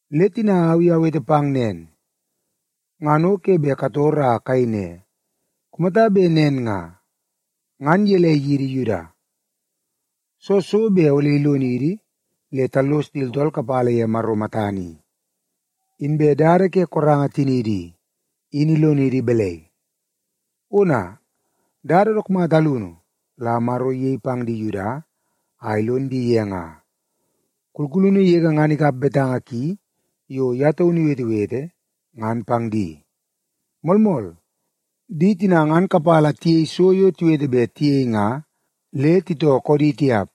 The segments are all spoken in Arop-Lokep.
Le tina au i awete pang nen, ngan o ke bet kator a kayei ne, “Kumata bet nen nga, ngan gelei yidi Yuda? Soo so bet ole ilonidi le tallos di tooltool kapala ye Maro matana i? Inbe dada ke koranga tiniidi i, in ilonidi balai?” Ona, dada dook mata alunu la Maro iyei pang di Yuda a ilon di ye nga. Kulkulunu yege ngan ikap betanga ki yo ye taunu iwetewete, ngan pang di. Moolmool, di tina ngan kapala tiyei so yo tiwete bet tiyei nga, le titoo koodi tiap.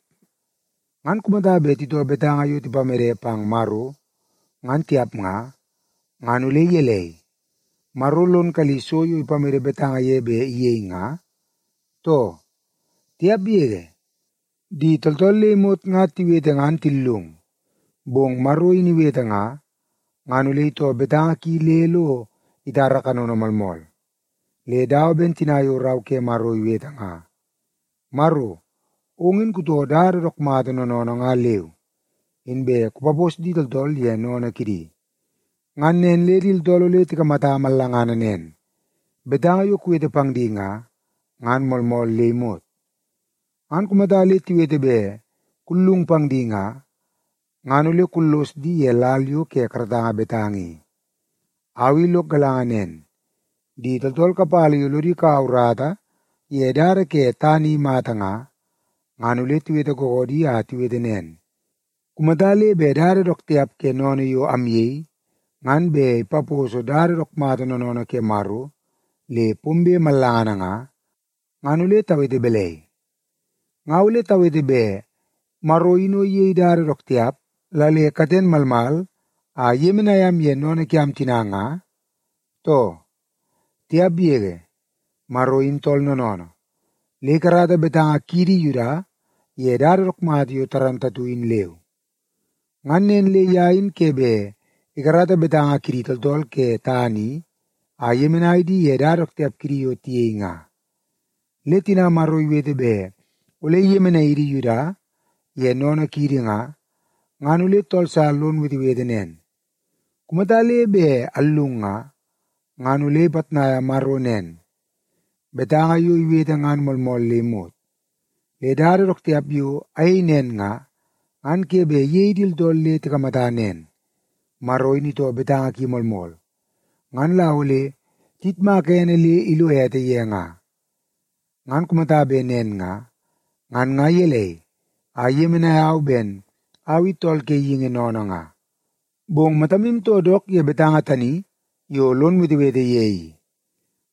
Ngan kumata bet titoo betanga yo tipamede pang Maro, ngan tiap nga, ngan ole gelei, Maro lon kalli so yo ipamede betanga ye bet iyei nga, too? Tiap yege! Di tooltool le imot nga tiwete ngan tillung, bong Maro in iwete nga, ngan ole itoo betanga ki le lo itara kanono moolmool. Le dawa ben tina yo Rau ke Maro iwete nga, “Maro, ong in kutoo dada dook mata noonoonoo nga leu, inbe kupapos di tooltool ye sennene kidi. Ngan nen le di tooltool ole tikamata mallanga nen, betanga yo kuwete pang di nga, ngan moolmool le imot. Ngan kumata le tiwete bet kullung pang di nga, ngan ole kullos di ye lal yo ke karatanga betanga i.” Au i lok galanga nen, di tooltool kapala yo lodi kaua urata ye dada ke tana i mata nga, ngan ole tiwete googoodi a tiwete nen, “Kumata le bet dada dook tiap ke sennene yo amyei, ngan bet ipaposo dada dook mata noonoonoo ke Maro le pombe mallangana nga, ngan ole tawete balai? Nga ole tawete bet Maro in o iyei dada dook tiap la le katen malmal a iyemenai am ye sennene kiam tina nga, too?” Tiap yege! Maro in tool noonoonoo, le ikarata betanga kiidi Yuda ye dada dook mata yo moolmool in leu. Ngan nen le ye in ke bet ikarata betanga kidi tooltool ke tana i a iyemenai di ye dada dook tiap kidi yo tiyei nga. Le tina Maro iwete bet ole iyemenai idi Yuda ye sennene kiidi nga, ngan ole tool sa lon wetewete nen, “Kumata le bet allung nga, ngan ole ipitnaia Maro nen, betanga yo iwete ngan moolmool le imot. Le dada dook tiap yo ayei nen nga, ngan ke bet iyei di tooltool le tikamata nen, Maro in itoo betanga ki moolmool, ngan la ole tiyitmaka ene le ilo ete ye nga. Ngan kumata bet nen nga, ngan nga gelei a iyemenai au ben au i tool ke geingi sennene nga?” Bong matamu too dook ye betanga tani yo lon wetewete ye i.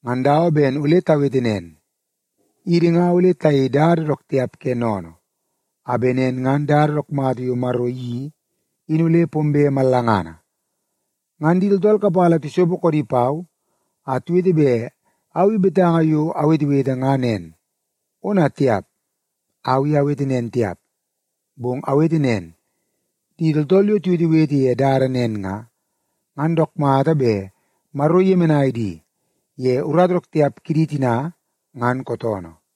Ngan dawa ben ole tawete ne, “Idi nga ole tayei dada dook tiap ke sennene, a bet nen ngan dada dook mata yo Maro iyeii in ole pombe mallangana.” Ngan di tooltool kapala tisopo koodi pau a tiwete bet au i betanga yo awetewete nga nen. Ona tiap, au i awete nen tiap, bong awete nen, di tooltool yo tiwetewete ye dada nen nga, ngan dook mata bet Maro iyemenai di ye urata dook tiap kidi tina ngan kootoonoo.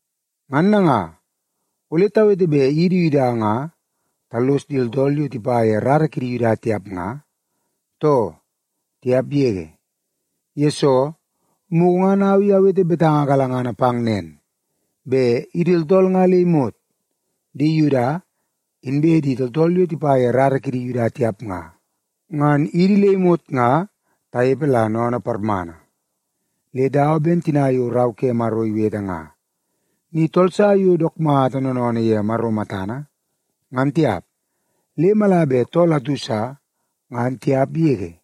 Ngan nanga, ole tawete bet idi Yuda nga tallos di tooltool yo tipa ye rara kidi Yuda tiap nga, too? Tiap yege! Yesoo, mugu ngan au i awete betanga galangana pang nen, bet idi tooltool nga le imot, di Yuda inbe di tooltool yo tipa ye rara kidi Yuda tiap nga, ngan idi le imot nga tanepe la sennene parmana. Le dawa ben tina yo Rau ke Maro iwete nga, “Ni tool sa yo dook mata noonoonoo ye Maro matana, ngan tiap, le mala bet tool atu sa, ngan tiap yege.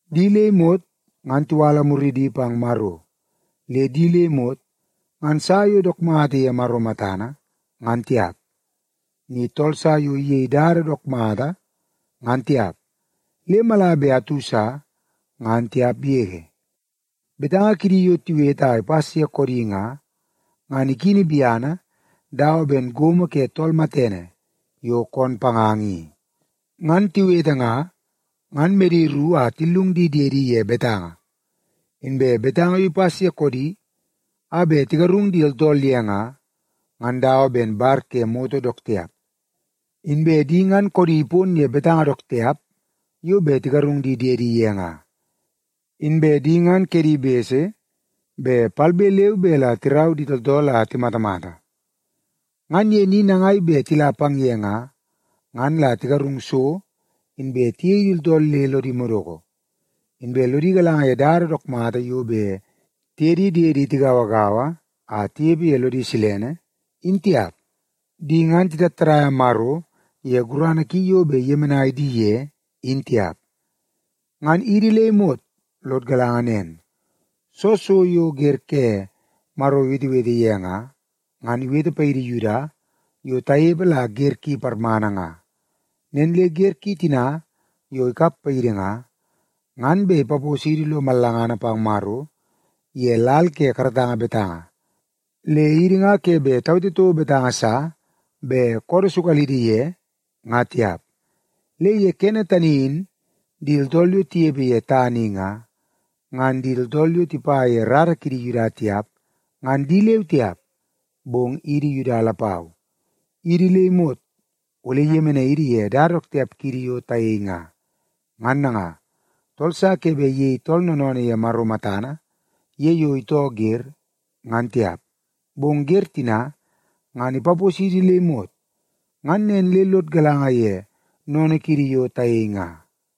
Di le imot ngan tiwala muridi pang Maro, le di le imot ngan sa yo dook mata ye Maro matana, ngan tiap. Ni tool sa yo iyei dada dook mata, ngan tiap, le mala bet tool atu sa, ngan tiap yege.” “Betanga kidi yo tiwete a ipas ye koodi nga, ngan ikini biana dawa ben gomo ke tool matene yo koon panganga i. Ngan tiwete nga, ngan medi ru a tillung di diedi ye betanga.” “Inbe betanga yo ipas ye koodi a bet tigarung di tooltool ye nga, ngan dawa ben bar ke moto dook tiap.” “Inbe di ngan koodi ipon ye betanga dook tiap yo bet tigarung di diedi ye nga.” “Inbe di ngan kedi bese bet palbe leu be la tirau di tooltool a timatamata. Ngan ye ni nangai bet tila pang ye nga, ngan la tigarung so inbe tiyei di tooltool le lodi madoko. Inbe lodi galanga ye dada dook mata yo bet tiye di diedi tigauagaua a tinepe ye lo silene, in tiap.” “Di ngan titattadaia Maro ye gurana ki yo bet iyemenai di ye, in tiap.” Ngan idi le imot lod galanga nen, soo so yo wer ke Maro iwetewete ye nga, ngan iwete paidi Yuda yo tanepe la wer ki parmana nga. Nen le wer ki tina yo ikap paidi nga, ngan bet ipaposidi lo mallangana pang Maro ye lal ke karatanga betanga, le idi nga ke bet tawete toko betanga sa bet koodoo sukalidi ye nga tiap. Le ye kene tani in di tooltool yo tinepe ye tana i nga, ngan di tooltool yo tipa ye rara kidi Yuda tiap, ngan di leu tiap, bong idi Yuda lapau, idi le imot ole iyemenai idi ye dada dook tiap kiidi yo tayei nga. Ngan nanga, tool sa ke bet iyei tooltool noonoonoo ye Maro matana ye yo itoo wer, ngan tiap. Bong wer tina ngan ipaposidi le imot ngan nen le lod galanga ye sennene kiidi yo tayei nga.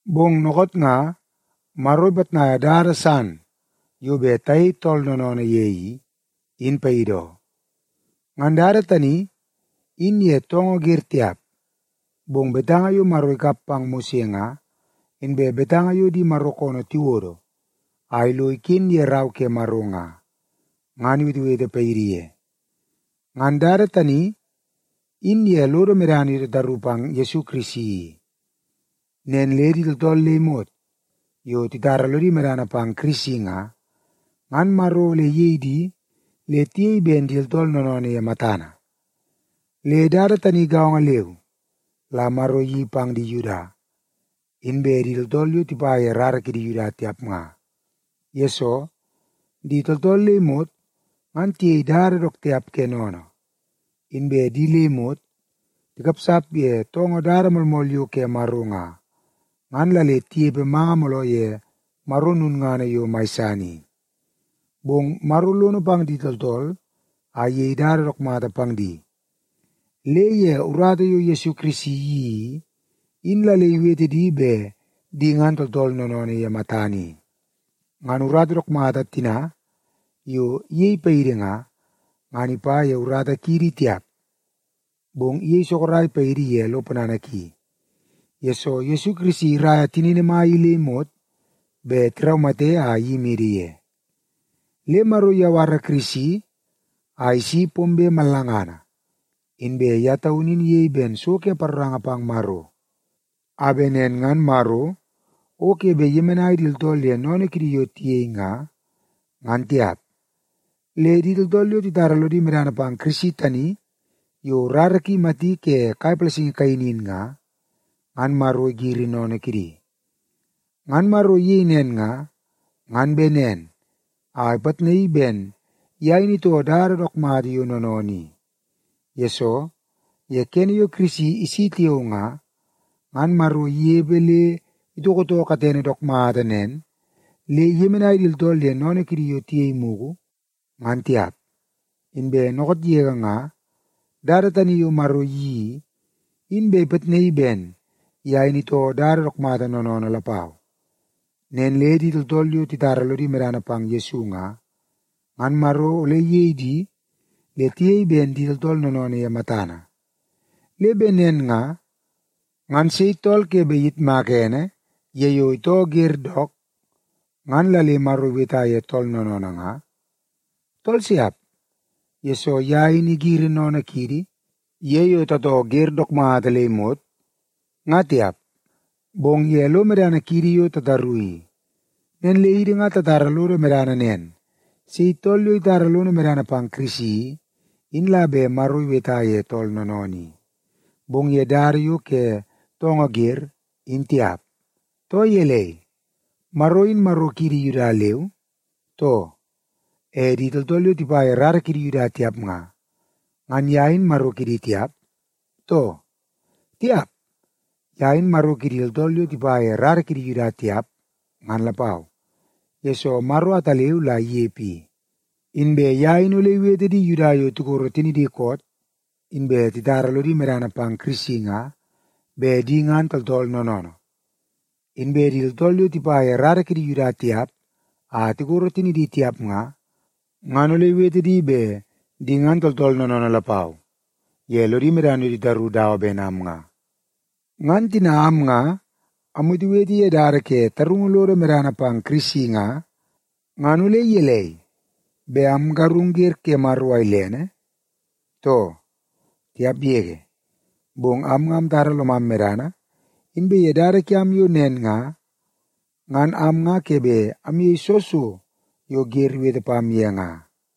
Bong dookoot nga, Maro ipitnaia dada san yo bet tayei tooltool noonoonoo ye i, in paidi oo. Ngan dada tani, in ye toongoo wer tiap, bong betanga yo Maro ikap pang Mose nga, inbe betanga yo di Maro koonoo tiwodo a lo iken ye Rau ke Maro nga, ngan iwetewete paidi ye. Ngan dada tani, in ye lodo medana yo tataru pang Yesu Kirisi i. Nen le di tooltool le imot yo titara lodi medana pang Kirisi nga, ngan Maro ole iyei di le tiyei ben di tooltool noonoonoo ye matana. Le dada tani gaongo leu la Maro iyeii pang di Yuda, inbe di tooltool yo tipa ye rara kidi Yuda tiap nga. Yesoo, di tooltool le imot ngan tiyei dada dook tiap ke sennene. Inbe di le imot tikapsap ye toongoo dada moolmool yo ke Maro nga, ngan la le tinepe manga mooloo ye Maro lulngana yo mai san i. Bong Maro lono pang di tooltool a iyei dada dook mata pang di, le ye urata yo Yesu Kirisi iyeii i, in la le iwete di ben di ngan tooltool noonoonoo ye matana i. Ngan urata dook mata tina yo iyei paidi nga, ngan ipa ye urata kiidi tiap, bong iyei sorok paidi ye lo ponana ki, yesoo Yesu Kirisi iraia tinini mai i le imot bet tiraumate a iyimidi ye. Le Maro iyawara Kirisi a isi pombe mallangana, inbe ye taunu in iyei ben so ke paroranga pang Maro, a bet nen ngan Maro o ke bet iyemenai di tooltool ye sennene kidi yo tiyei nga, ngan tiap. Le di tooltool yo titara lodi medana pang Kirisi tani yo rara ki imati ke kai palasingi kaini in nga, ngan Maro igiri sennene kidi. Ngan Maro iyei nen nga, ngan bet nen a ipitnaii ben ye in itoo dada dook mata yo noonoonoo i. Yesoo, ye kene yo Kirisi isi tiao nga, ngan Maro inepe le itoko too katene dook mata nen le iyemenai di tooltool ye sennene kidi yo tiyei mugu, ngan tiap. Inbe dookoot yege nga, dada tani yo Maro iyeii i, in bet ipitnaii ben ye in itoo dada dook mata noonoonoo lapau. Nen le di tooltool yo titara lodi medana pang Yesu nga, ngan Maro ole iyei di le tiyei ben di tooltool noonoonoo ye matana. Le bet nen nga, ngan sei tool ke bet iyitmak ene ye yo itoo wer dook, ngan la le Maro iweta ye tool noonoonoo nga? Tool siap, yesoo ye in igiri sennene kiidi, ye yo tatoo wer dook mata le imot, nga tiap, bong ye lo medana kiidi yo tataru i. Nen le idi nga tatara lodo medana nen, sei tool yo itara lono medana pang Kirisi i, in la bet Maro iweta ye tool noonoonoo i. Bong ye dada yo ke toongoo wer, in tiap. Too gelei, Maro in Maro kiidi Yuda leu, too? E di tooltool yo tipa ye rara kidi Yuda tiap nga, ngan ye in Maro kidi tiap, too? Tiap, ye in Maro kidi tooltool yo tipa ye rara kidi Yuda tiap, ngan lapau, yesoo Maro ataleu la inepe i. Inbe ye in ole iwete di Yuda yo tikoro tinidi koot inbe titara lodi medana pang Kirisi nga, bet di ngan tooltool noonoonoo. Inbe di tooltool yo tipa ye rara kidi Yuda tiap a tikoro tinidi tiap nga, ngan ole iwete di bet di ngan tooltool noonoonoo lapau ye lodi medana yo titaru dawa ben am nga. Ngan tina am nga amwetewete ye dada ke tarungu lodo medana pang Kirisi nga, ngan ole gelei, bet amgarung wer ke Maro a ilene, too? Tiap yege! Bong am nga amtara lomam medana, inbe ye dada kiam yo nen nga, ngan am nga ke bet ayei soo so yo wer iwete pam ye nga.